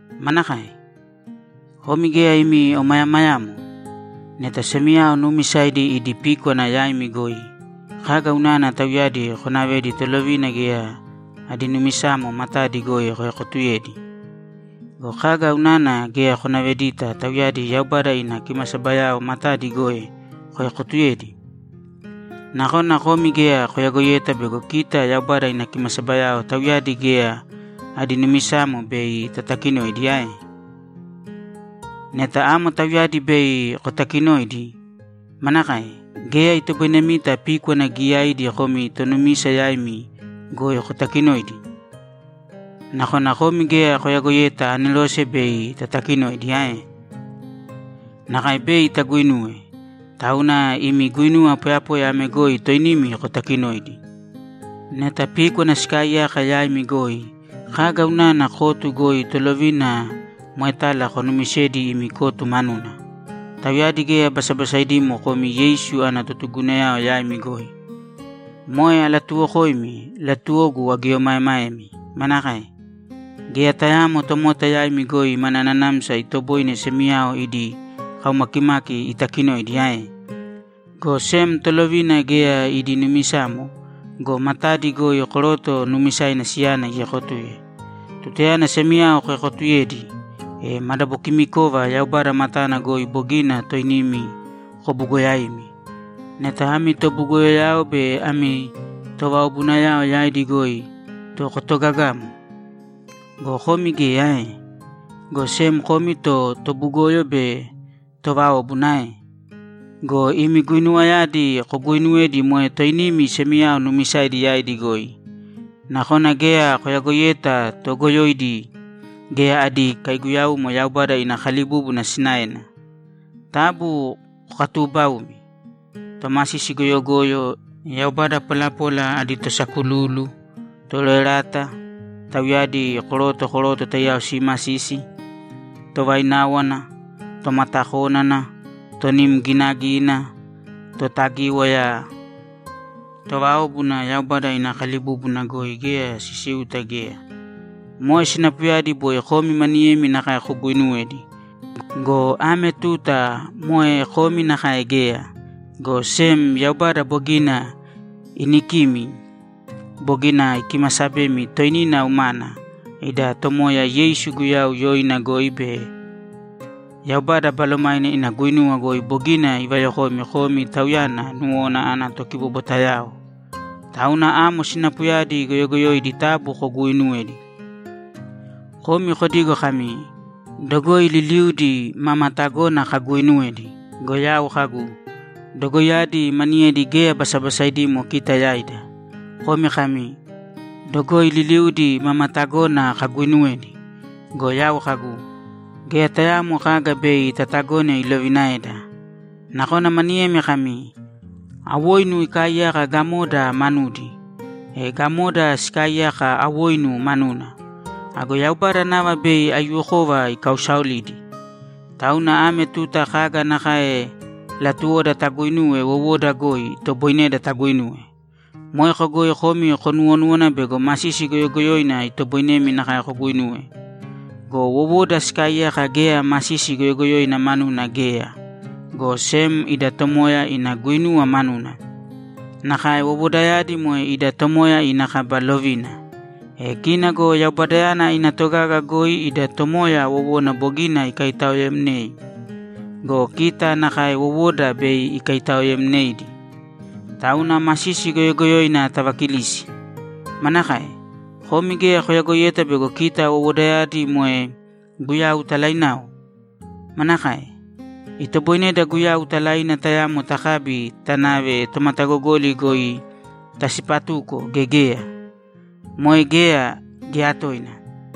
Manakae? Komi geya imi omayamayamo? Neta semiyao nuumisaidi idi píkwana yaimi goi, kaga unana tauyadi konavedi tolovina geya adi numisamo matadi goi koekotuyedi? Go kaga unana geya konavedita tauyadi Yaubada ina kimasabayao matadi goi koekotuyedi? Nakona komi geya koyagoiyeta bego kita Yaubada ina kimasabayao tauyadi geya adi numisamo bei tatakinoidi ae? Neta amo tauyadi bei kotakinoidi, manakae? Geya itoboinemita píkwana giyaidi komi tonumisa yaimi goi kotakinoidi? Nakona komi geya koyagoiyeta anerose bei tatakinoidi ae? Nakae bei taguinuwe, tauna imi guinuwa poyapoya ame goi toinimi kotakinōidi. Neta píkwana sikaaiyaka yaimi goi, kaga unana kotu goi tolovina moetala konumisedi imi kotu manuna? Tauyadi geya basabasaidimo komi Yeisu ana totugugunayao yaimi goi. Moe alatuuwokoimi, latuwogu agieomaemaemi. Manakae? Geya tayaamo tomota yaimi goi mana nanamsa itoboine semiyao idi kaumakimaki itakinoidi ae? Go sem tolovina geya idi numisamo go, matadi goi koroto nuumisaina siyana iekotuye. Tutayana semiyao koekotuyedi, e madabokimikova Yaubada matana goi bogina toinimi kobugoyaimi. Neta ami tobugoyoyao be ami tovaobunayao yaidi goi to kotogagamo! Go komi geya ae? Go sem komi to tobugoyo be továobuna ae? Go imi guinuwayadi koguuinuwedi moe toinimi semiyao nuumisaidi yaidi goi. Nakona geya koyagoiyeta toogoyoidi geya adi kaiguyaumo Yaubada ina kalibúbuna sinaena. Taabu kokatuubaūmi. Tomasisi goyogoyo, yaubada polapola adi tosakululu, toroerata, tauyadi koroto koroto taiyao simasisi, tovaináwana, tomatakónana, tonim ginagina, totagíwaya, továobuna Yaubada ina kalibúbuna goi geya sisiuta geya! Moe sinapuyadi boi komi maniyemi nakae koguuinuwedi go, ame tuta moe komi nakae geya, go sem Yaubada bogina inikimi, bogina ikimasabemi toinina umana, ida Tomoya Yeisu Guyau yoina goi be Yaubada Balomaina ina guinuwa goi bogina ivayokoimi komi Tauyana nuwona ana tokibobwatayao. Tauna amo sinapuyadi goyogoyoidi taabu koguuinuwēdi! Komi kodigo kami, ‘Dogoi liliuudi mama tagona kaguuinuwedi.’ Go yau kagu, ‘Dogoiyadi maniyedi geya basabasaidimo kita yaida.’ Komi kami, ‘Dogoi liliuudi mama tagona kaguuinuwedi.’ Go yau kagu, ‘Geya tayaamo kaga bei tatagone ilovinaeda.’ Nakona maniyemi kami, ‘Awoinu ikaaiyaka gamoda manudi, e gamoda sikaaiyaka awoinu manuna. Ago Yaubada nava bei aiyuwokova ikausaolidi. Tauna ame tuta kaga nakae latuwoda taguinuwe wowoda goi, itoboineda taguinuwe.’ Moeko goi komi konuwonúwana bego masisi goyogoyoina itoboinemi nakae koguinuwe. Go wowoda sikaaiyaka geya masisi goyogoyoina manuna geya, go sem ida Tomoya ina guinuwa manuna. Nakae wowodayadi moe ida Tomoya ina kaba lovina. E kina go Yaubadayana ina togaga goi ida Tomoya wowona bogina ikaitaoemnei go, kita nakae wowoda bei ikaitaoemneidi. Tauna masisi goyogoyoina tavakilīsi! Manakae? Komi geya koyagoiyeta bego kita wowodayadi moe Guyau talainao? Manakae? Itoboineda Guyau talaina tayamo takabi tanave tomatagogoli goi tasipatuko gea geya? Moe geya, geya tooina!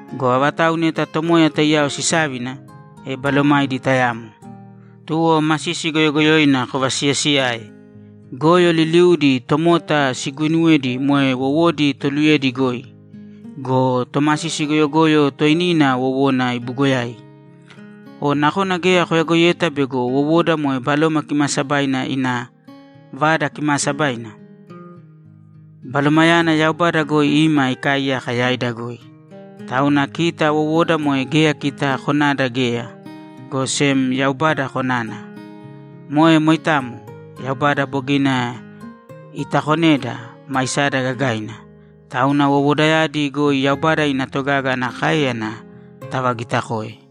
Go avatau neta Tomoya taiyao sisávina, e balomaidi tayamo. Tuwo masisi goyogoyoina kovasiyasiyāe. Goyo liliudi tomota siguuinuwedi moe wowodi toluyedi goi go, tomasisi goyogoyo toinina wowona ibugoyai. O nakona geya koyagoiyeta bego wowoda moe Baloma Kimaasabaina ina Vada Kimaasabaina? Balomayana Yaubada goi ima ikaaiyaka yaida goi. Tauna kita wowoda moe geya kita konada geya, go sem Yaubada konana. Moe moitamo. Yaubada bogina itakoneda, maisada gagaina. Tauna wowodayadi goi Yaubada ina togaga ana káeyana tavagitakōe.